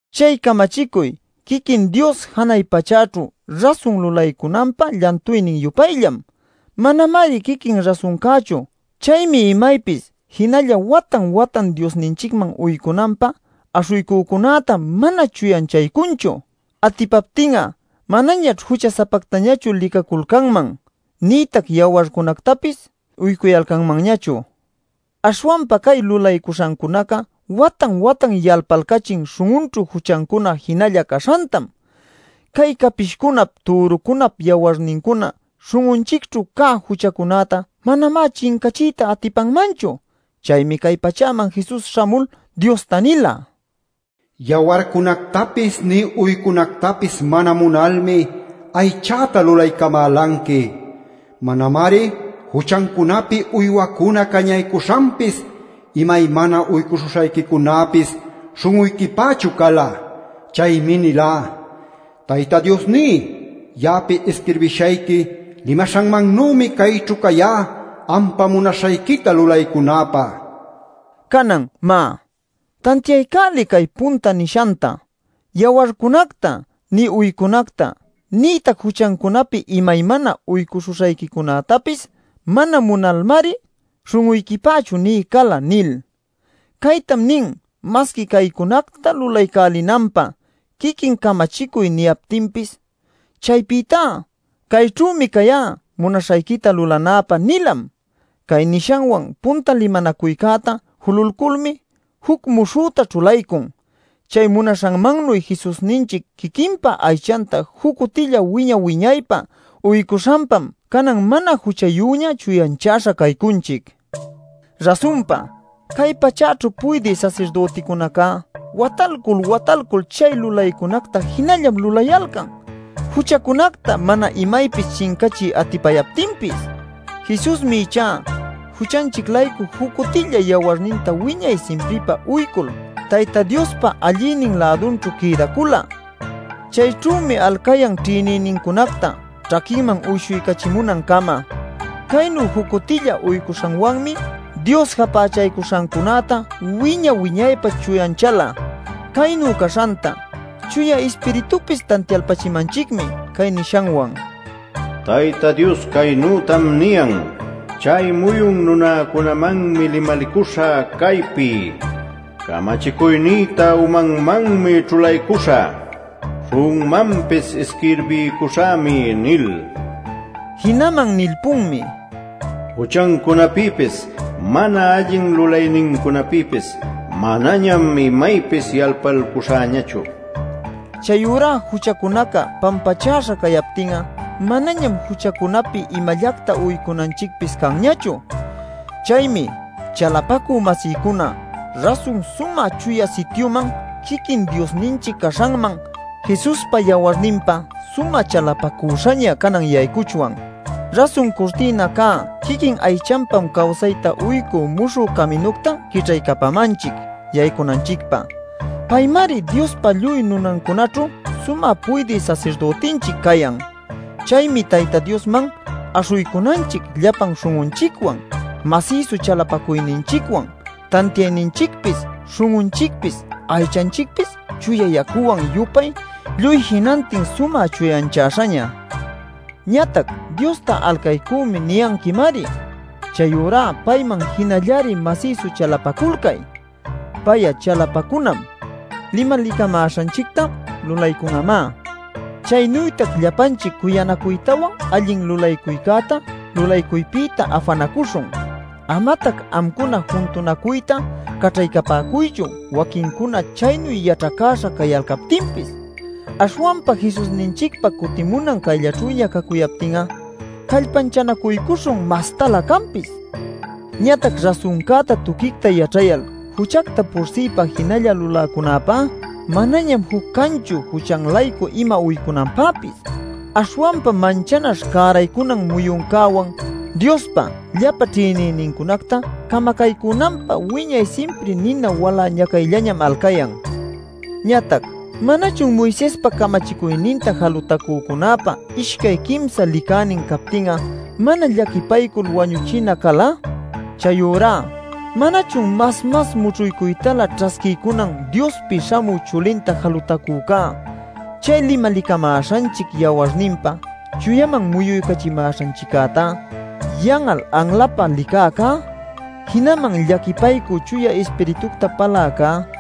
Chay camachicuy quiquin Dios janay pachäćhu rasun lulaycunanpä llantuynin-yupayllam; manamari quiquin rasuncäćhu. Chaymi imaypis jinalla watan-watan Diosninchicman uycunanpä aśhuycücunäta mana chuyanchaycunchu. Atipaptin'a manañaćh jucha-sapactañachu licaculcanman, nïtac yawarcunactapis uycuyalcanmanñachu. Aśhwanpa cay lulaycuśhancunaca watan-watan yalpalcachin śhun'unćhu juchancuna jinalla caśhantam. Cay capishcunap türucunap yawarnincuna śhun'unchicćhu cä juchacunäta manamá chincachiyta atipanmanchu. Chaymi cay pachäman Jesus śhamul Diosta nila: “Yawarcunactapis nï uycunactapis mana munalmi aychäta lulaycamälanqui. Manamari juchancunapi uywacuna cañaycuśhanpis imaymana uycuśhuśhayquicunäpis śhun'uyquipächu cala. Chaymi nilá: ‘Tayta Diosní, ya'api isquirbishayqui limaśhanmannümi cayćhu cayá ampa munaśhayquita lulaycunäpä’” nil. Canan, má, tantiaycäliy cay punta nishanta: “Yawarcunacta nï uycunacta nïtac juchancunapi imaymana uycuśhuśhayquicunätapis mana munalmari śhun'uyquipächu nï cala” nil. Caytam nin masqui caycunacta lulaycälinanpä quiquin camachicuy niyaptinpis. Chaypïtá: “Cayćhümi cayá munaśhayquita lulanäpä” nilam. Cay nishanwan punta limanacuycäta jululculmi juc muśhüta ćhulaycun. Chay munaśhanmannuy Jesusninchic quiquinpa aychanta juc cutilla wiña-wiñaypä uycuśhanpam canan mana juchayüña chuyanchäśha caycunchic. Rasunpa, cay pachäćhu puydï sasirdüticunaca watalcul watalcul chay lulaycunacta jinallam lulayalcan juchacunacta mana imaypis chincachiy atipayaptinpis. Jesusmi ichá juchanchic-laycu juc cutilla yawarninta wiñay simpripä uycul Tayta Diospa allïnin-lädunćhu quïdacula. Chayćhümi alcayan ćhïnïnincunacta ćhaquinman uyshuycachimunancama. Caynu juc cutilla uycuśhanwanmi Dios japächaycuśhancunäta wiña-wiñaypä chuyanchäla. Caynu caśhanta Chuya Ispiritupis tantialpachimanchicmi cay nishanwan: “Tayta Dios caynütam niyan: ‘Chay muyun nunäcunamanmi limalicuśhä caypi: camachicuynïta umanmanmi ćhulaycuśhä; śhun'unmanpis isquirbiycuśhämi’ nil”. Jinaman nilpunmi: “Juchancunapïpis mana allin lulaynincunapïpis manañam imaypis yalpalcuśhäñachu” nil. Chayurá juchacunaca pampachäśha cayaptin'a manañam juchacunapi imallacta uycunanchicpis canñachu. Chaymi, chalapacü-masïcuna, rasun Sumä Chuya Sityuman, quiquin Diosninchic caśhanman, Jesuspa yawarninpa sumä chalapacüśhaña canan yaycuchwan. Rasun curtïna cä quiquin aychanpam cawsayta uycü muśhü caminucta quićhaycapamanchic yaycunanchicpä. Paymari Diospa lluy nunancunaćhu sumä puydï sasirdütinchic cayan. Chaymi Tayta Diosman aśhuycunanchic llapan śhun'unchicwan, masïsu chalapacuyninchicwan, tantiayninchicpis śhun'unchicpis aychanchicpis chuya yacuwan-yupay lluy jinantin sumä chuyanchäśhaña. Ñatac “Diosta alcaycümi” niyanquimari. Chayurá payman jinallari masïsu chalapaculcay; pay'a chalapacunam; limalicamäśhanchicta lulaycun'amá. Chaynütac llapanchic cuyanacuytawan allin lulaycäta lulaycuypïta afanacuśhun. Amatac amcuna juntunacuyta caćhaycapäcuychu waquincuna chaynu yaćhacäśha cayalcaptinpis. Aśhwanpa Jesusninchicpa cutimunan cayllaćhüña cacuyaptin'a callpanchanacuycuśhun mastalä canpis. Ñatac rasuncäta tuquicta yaćhayal juchacta pursïpa jinalla luläcunäpá manañam juc canchu juchan-laycu ima uycunanpäpis. Aśhwanpa manchanaśh cäraycunan muyuncäwan, Diospa llapa ćhïnïnincunacta camacaycunanpä wiñay simpri nina walä ñacaycällañam alcayan. Ñatac ¿manachun Moisespa camachicuyninta jalutacücunäpä ishcay quimsa licänin captin'a mana llaquipaycul wañuchina cala? Chayurá ¿manachun mas-mas mućhuycuytalä ćhasquiycunan Diospi śhamü chulinta jalutacücá, chay limalicamäśhanchic yawarninpa chuyaman muyuycachimäśhanchiccäta yan'al anlapä licäcá, jinaman llaquipaycü Chuya Ispiritucta paläcá?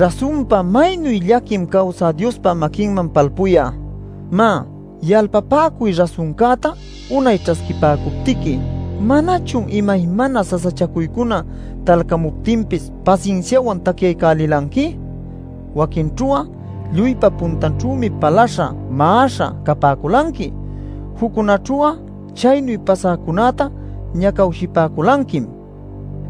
Rasunpa ¡maynu llaquim cawsä Diospa maquinman palpuy'a! Má, yalpapäcuy rasuncäta unay ćhasquipäcuptiqui ¿manachun imaymana sasachacuycuna talcamuptinpis pasinsiawan tacyaycälilanqui? Waquinćhu'a lluypa puntanćhümi palaśha, ma'aśha capäculanqui. Juccunaćhu'a chaynu pasäcunäta ñacawshipäculanquim.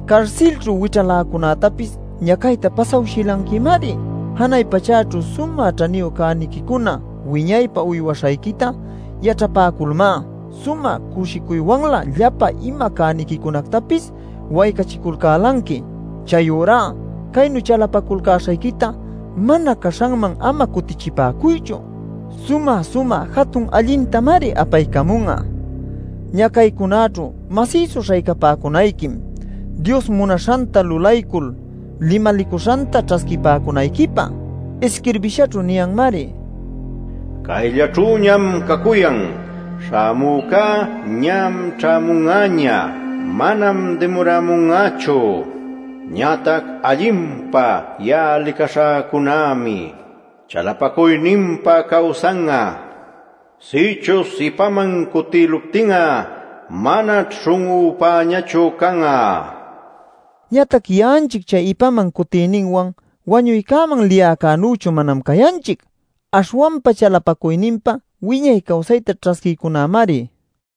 Carsilćhu wićhaläcunätapis ñacayta pasawshilanquimari. Janay pachäćhu sumä ćhaniyu cäniquicuna wiñaypä uywaśhayquita yaćhapäculmá sumä cushicuywanlä llapa ima cäniquicunactapis waycachiculcälanqui. Chayurá caynu chalapaculcäśhayquita mana caśhanman ama cutichipäcuychu; sumä-sumä jatun allintamari apaycamun'a. Ñacaycunaćhu masïsu śhaycapäcunayquim Dios munaśhanta lulaycul limalicuśhanta ćhasquipäcunayquipä. Isquirbishaćhu niyanmari: “Cayllaćhüñam cacuyan; śhamüca ñam ćhämun'aña; manam dimuramun'achu. Ñatac allinpa ya'a licaśhäcunämi chalapacuyninpa cawsan'a; sïchuśh ipaman cutïluptin'a manaćh śhun'üpäñachu can'a” nil. Ñatac ya'anchic chay ipaman cutiyninwan wañuycäman liyäcänüchu manam cayanchic. Aśhwanpa chalapacuyninpa wiñay cawsayta ćhasquïcunämari.